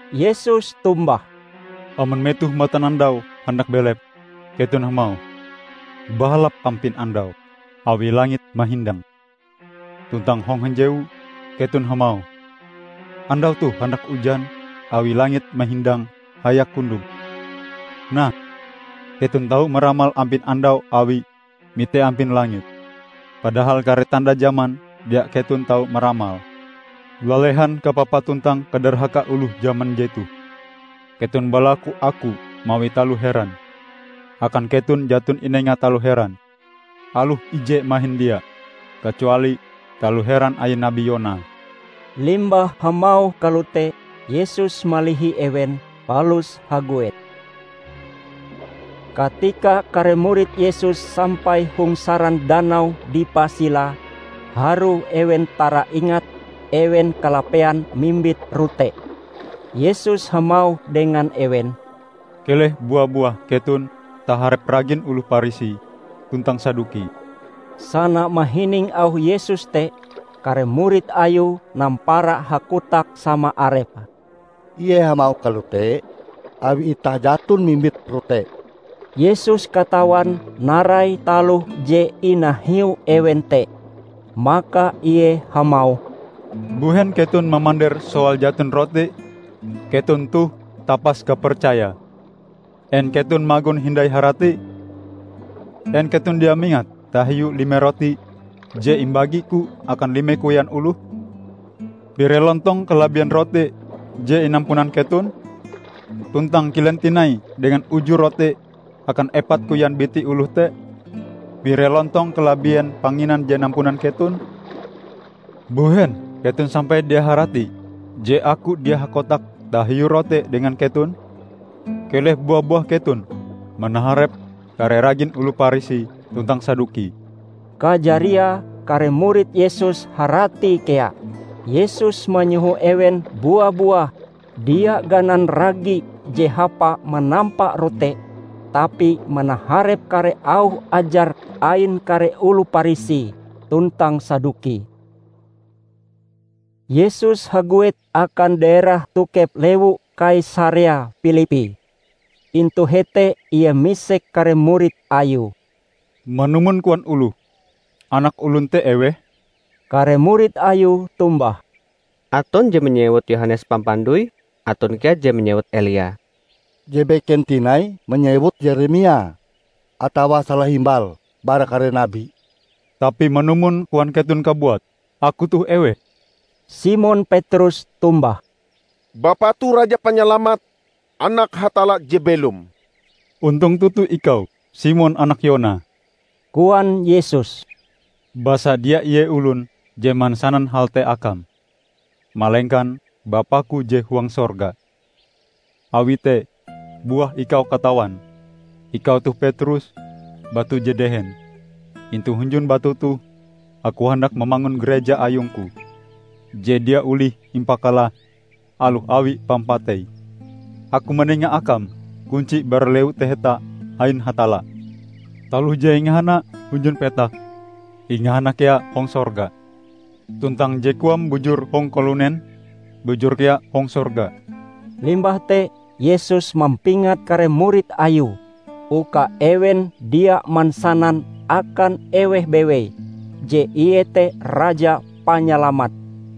Yesus tombah, ["Amon metoh matanandau handak belep, keton hamauh, 'Bahalap ampin andau, awi langite mahindang.' Tuntang hong hanjewu, keton hamauh, 'Andau toh handak ujan awi langit mahindang hayak kundom.' Nah, keton tau maramal ampin andau awi mite ampin langit, padahal kare tanda jaman dia keton tau maramale!"] "Lalehan kapapae tuntang kadarhakae oloh jaman jetoh. Keton balaku Aku mawi taloh heran. Akan keton jaton inenga taloh heran. Aloh ije mahin dia, kacuali taloh heran ain nabi Yona." Limbah hamauh kalote Yesus malihi ewen, palus haguet. Katika kare murid Yesus sampai hong saran danau dipah silae, harue ewen taraingat ewen kalapean mimbit rote. Yesus hamauh dengan ewen, "Keleh bua-buah keton taharep ragin oloh Parisi tuntang Saduki." Sana mahining auh Yesus te, kare murid Ayue nampara hakotak sama arepe, "Ie hamauh kalote awi itah jaton mimbit rote." Yesus katawan narai taloh je inahiu ewen te. Maka Ie hamauh, "Mbuhen keton mamander soal jaton rote? Keton toh tapas kapercaya! En keton magon hindai harati? En keton dia mingat tahiu lime rote je imbagi-Ku akan lime koyan oloh? Pire lontong kalabien rote je inampunan keton? Tuntang kilen tinai dengan uju rote akan epat koyan biti oloh te? Pire lontong kalabien panginan je nampunan keton? Mbuhen keton sampai dia haratie je Aku dia hakotak tahiu rote dengan keton? Keleh bua-buah keton manaharep kare ragin oloh Parisi tuntang Saduki!" Kajariae kare murid Yesus haratie kea Yesus manyoho ewen bua-buah dia ganan ragi je hapa manampa rote, tapi manaharep kare auh ajar ain kare oloh Parisi tuntang Saduki. Yesus haguet akan daerah tokep lewu Kaisarea Pilippi. Intu hete Ie misek kare murid Ayue, "Manumon koan oloh, Anak Olon te eweh?" Kare murid Ayue tombah, "Aton je manyewut Yohanes Pampandoi. Aton kea je manyewut Elia. Je beken tinai manyewut Yeremia, atawa salahimbal bara kare nabi." "Tapi manumon koan keton kabuat, Aku toh eweh?" Simon Petrus tombah, "Bapa toh Raja Panyalamat, Anak Hatalla je belom." "Ontong toto ikau, Simon anak Yona!" koan Yesus, "Basa dia ie olon je mansanan hal te akam, malengkan Bapa-Ku je huang sorga. Awi te buah ikau katawan, ikau toh Petrus, batu je dehen, intu hunjun batu toh Aku handak mamangun Gareja ayung-Ku, je dia olih impakalah; aloh awi pampatei! Aku manenga akam kunci bara Lewu Taheta ain Hatalla. Taloh je ingahana hunjun petak, ingahana kea hong sorga. Tuntang je koam bujur hong kalunen, bujur kea hong sorga." Limbah te Yesus mampingat kare murid Ayue uka ewen dia mansanan akan eweh bewei je Ie te Raja Panyalamat.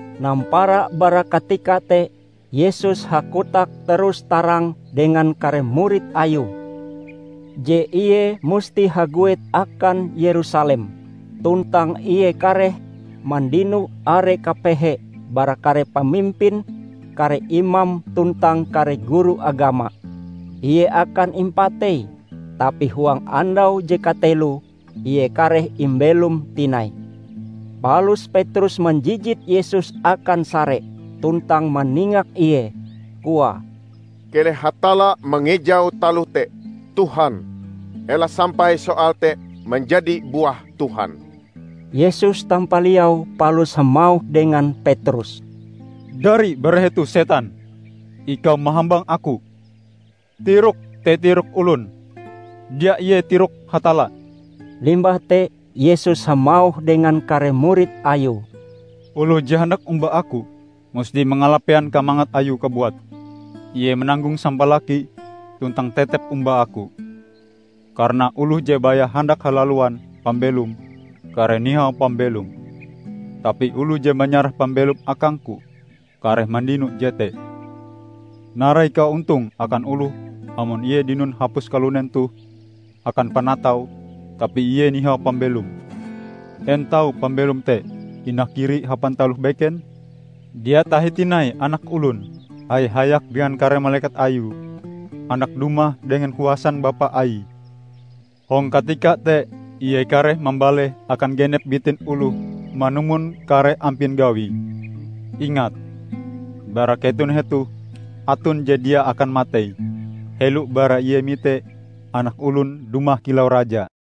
Nampara bara katika te, Yesus hakotak terus-tarang dengan kare murid Ayue, je Ie musti haguet akan Yerusalem tuntang Ie kareh mandino are kapehe bara kare pamimpin, kare imam tuntang kare guru agama. Ie akan impatei, tapi huang andau je kateloe Ie kareh imbelom tinai. Palus Petrus manjijit Yesus akan sare tuntang maningak Ie, koae, "Keleh Hatalla mangejau taloh te, Tuhan! Ela sampai soal te manjadi buah Tuhan!" Yesus tampaliau palus hamauh dengan Petrus, dari bara hetoh, setan! Ikau mahambang Aku. Tirokm te tirok olon; dia ie tirok Hatalla! Limbah te Yesus hamauh dengan kare murid Ayue, "Oloh je handak omba Aku, musti mangalapean kamangat ayue kabuat, ie mananggong sampalakie tuntang tetep omba Aku. Karana oloh je baya handak halaluan pambelome, kareh nihau pambelome. Tapi oloh je manyarah pambelome akang-Ku, kareh mandino jete. Narai kaontonge akan oloh amon ie dinon hapus kalunen toh akan panataue tapi ie nihau pambelome? En tau pambelom te inakiri hapan taloh beken? Dia tahi tinai Anak Olon, haya-hayak dengan kare malekat Ayue, handak dumah dengan kuasan Bapa Aie. Hong katika te ie kareh mambaleh akan genep bitin oloh manumon kare ampin gawie. Ingat! Bara keton hetoh aton je dia akan matei, helo bara ie mite Anak Olon dumah kilau Raja."